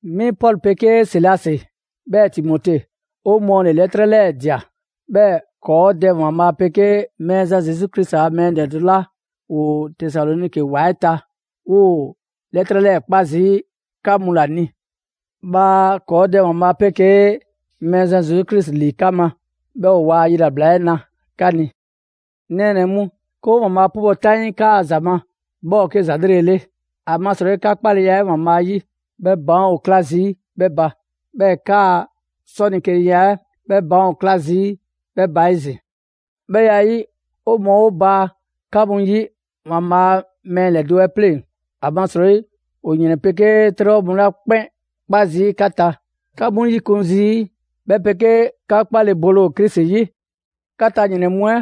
Mi Pɔlu 'pegee Silasi 'bhɛɛ‑ Timote, 'o mɔɔ ‑le 'lɛtrɛ 'lɛɛ‑ ꞊dia. 'Bhɛɛ‑ ‑kɔɔ Dɛ ‑Waanbhaa' 'pegee Mɛɛzan Zesu Krisi a mɛɛ ‑lɛdo' 'la ‑woo Tesaloniki ‑wa 'ɛ ta, 'woo‑ 'lɛtrɛ 'lɛɛ‑ 'kpa zii' 'ka mu ‑la ni. Bhaa ‑kɔɔ' Dɛ ‑Waanbhaa' 'pegee Mɛɛzan Zesu Krisi ‑li 'ka ma, 'bhɛɛ‑ ‑o waa yilabla 'ɛ 'na 'ka ni. 'Ŋ nɛɛnɛ‑ mu, 'ke 'o ‑Waanbhaa' 'pubɔ‑ 'taŋii 'kaa‑ ‑za ma, 'bhɛ ‑o 'ke ‑za 'lrele‑ 'le. ‑Amasrɔyi 'ka 'kpaleya 'ɛ ‑Waanbhaa' 'yi 'bhɛ baan' ‑o 'kla zii' 'bhɛ ba, 'bhɛɛ‑ 'kaa‑ 'sɔlekeniya 'ɛ 'bhɛ baan' ‑o 'kla zii' 'bhɛ ba 'ezin‑. 'Bhɛ ya 'ɛ 'yi, 'o mɔɔ 'o baa 'ka mu 'yi ‑Waanbhaa' a mɛɛ ‑lɛdo' 'ɛ 'pleŋ‑. ‑Amasrɔyi ‑o ‑yrɛn 'pegee 'trɛbhɔ mu 'la 'kpɛn 'kpa zii' 'ka ta, 'ka 'mu 'yikun zii' 'bhɛ 'pegee 'ka 'kpale‑ bole ‑o Krisi 'yi. 'Ka ta ‑yrɛn mu 'ɛ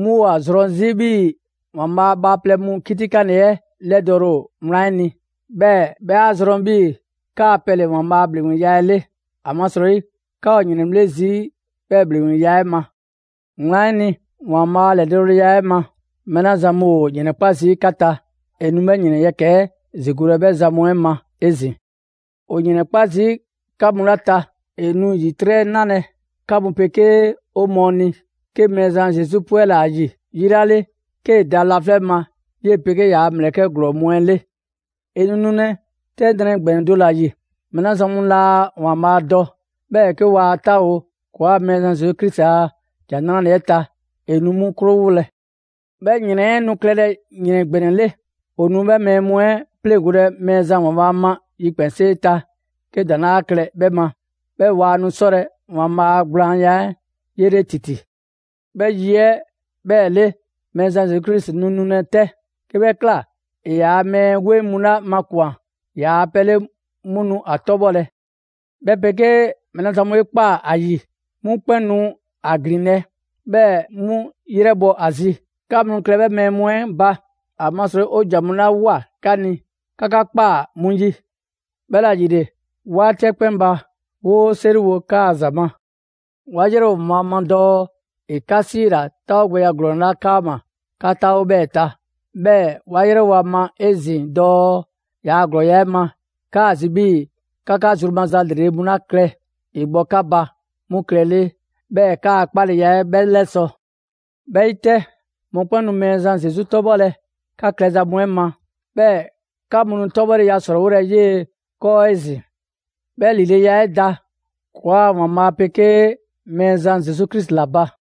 'mu ‑o ‑a zrɔn 'zi 'bhii‑ ‑Waanbhaa' a bhaaplɛŋ mu 'kitikanle 'ɛ 'lɛdɔɔle ‑o wlan 'ɛ ni, 'bhɛɛ‑ 'bhɛ 'a zrɔn 'bhii‑ 'kaa‑ pɛ ‑le ‑Waanbhaa' a ‑bhleŋgbeya 'ɛ 'le. ‑Amasrɔyi, 'ka ‑o ‑yrɛnbhle' zii' 'bhɛɛ‑ ‑bhleŋgbeya 'ɛ ma. Wlan 'ɛ ni, ‑Waanbhaa' a ‑lɛdɔɔleya 'ɛ ma, mɛɛ 'la zan mu ‑o ‑yrɛnkpa' zii' 'ka ta; ‑e nu 'bhɛ ‑yrɛn yɛkɛ‑ 'ɛ ‑zigolɛ 'bhɛ zan mu 'ɛ ma 'ezin‑. ‑O ‑yrɛnkpa' zii' 'ka mu 'la ta, ‑e nu ‑yitrɛ' nalɛ 'ka mu 'pegee 'o mɔɔ ni, 'ke Mɛɛzan Zesu 'pwɛla‑ ‑a ‑yi yi 'la 'le 'kee‑ da laflɛ' ma 'yee‑ 'pegee ‑yaa' ‑mlɛkɛ' ‑glɔɔ mu 'ɛ 'le. ‑E nu nulɛ 'tɛ nrɛ ‑gbɛnɛ do ‑la ‑yi. Mɛɛ 'la zan mu laa ‑Waanbhaa' dɔ, 'bhɛɛ‑ 'ke waa 'taawo‑ ‑kɔɔa' Mɛɛzan Zesu Krisi a ‑Jan 'Nrale‑ 'ɛ ta, ‑e nu 'mu 'krowolɛ. 'Bhɛ ‑yrɛn 'ɛ nu klɛlɛ ‑yrɛn ‑gbɛnɛ 'le. ‑O nu 'bhɛ mɛɛ mu 'ɛ 'pleŋgolɛ Mɛɛzan ‑Waanbhaa' ma yikpɛnsee ta 'ke ‑daŋ' 'laa klɛ 'bhɛ ma, 'bhɛɛ‑ waa nu 'sɔlɛ‑ ‑Waanbhaa' a gblaanya 'ɛ 'yele ‑titi. 'Bhɛ yi 'ɛ 'bhɛɛ‑ 'le, Mɛɛzan Zesu nu nulɛ 'tɛ. 'Ke 'bhɛ ꞊kla, ‑e ‑yaa' mɛɛ 'weŋ mu 'la makwan‑ ‑yaa' pɛ 'le 'mu nu 'a 'tɔbhɔlɛ; 'bhɛ 'pegee mɛɛ 'la zan mu 'ɛ 'e 'kpaa‑ ‑a ‑yi, 'mu 'kpɛn nu 'a ‑glinlɛ', 'bhɛɛ‑ 'mu 'yrɛbhɔ ‑a zi. 'Ka mu nu klɛlɛ 'bhɛ mɛɛ mu 'ɛ ba, ‑amasrɔyi 'o ‑jan mu 'la ꞊woa 'ka ni, 'ka 'ka ꞊kpaa 'mu 'yi. 'Bhɛla‑ ‑yile, 'waati 'ɛ 'kpɛn ba, 'woo 'seriwo 'kaa‑ ‑za ma. 'Wa 'yrɛwo‑ ‑Waanbhaa' dɔɔ ‑e 'ka 'siila‑ 'taawogbɛya ‑glɔɔn 'la 'kaama‑, 'ka 'taawo‑ 'bhɛɛ‑ ta. 'Bhɛɛ‑ 'wa 'yrɛwo‑ ‑a ma 'ezin‑ dɔɔ yaa ‑glɔɔya' 'ɛ ma, 'kaa‑ zi 'bhii‑ 'ka 'ka zru maza 'lrele‑ mu 'la klɛ ‑e bhɔ 'ka ba 'mu klɛlele; 'bhɛɛ‑ 'kaa‑ 'kpaleya 'ɛ 'bhɛ 'lɛsɔ‑. 'Bhɛ 'yi 'tɛ, mɔkpɛn' nu Mɛɛzan Zesu 'tɔbhɔlɛ 'ka klɛza mu 'ɛ ma; 'bhɛɛ‑ 'ka mu nu 'tɔbhɔleya ‑srɔɔwolɛ 'yee‑ 'kɔɔ 'ezin‑. 'Bhɛ ‑lileya 'ɛ da ‑kɔɔa' ‑Waanbhaa' 'pegee Mɛɛzan Zesu Krisi ‑la ba.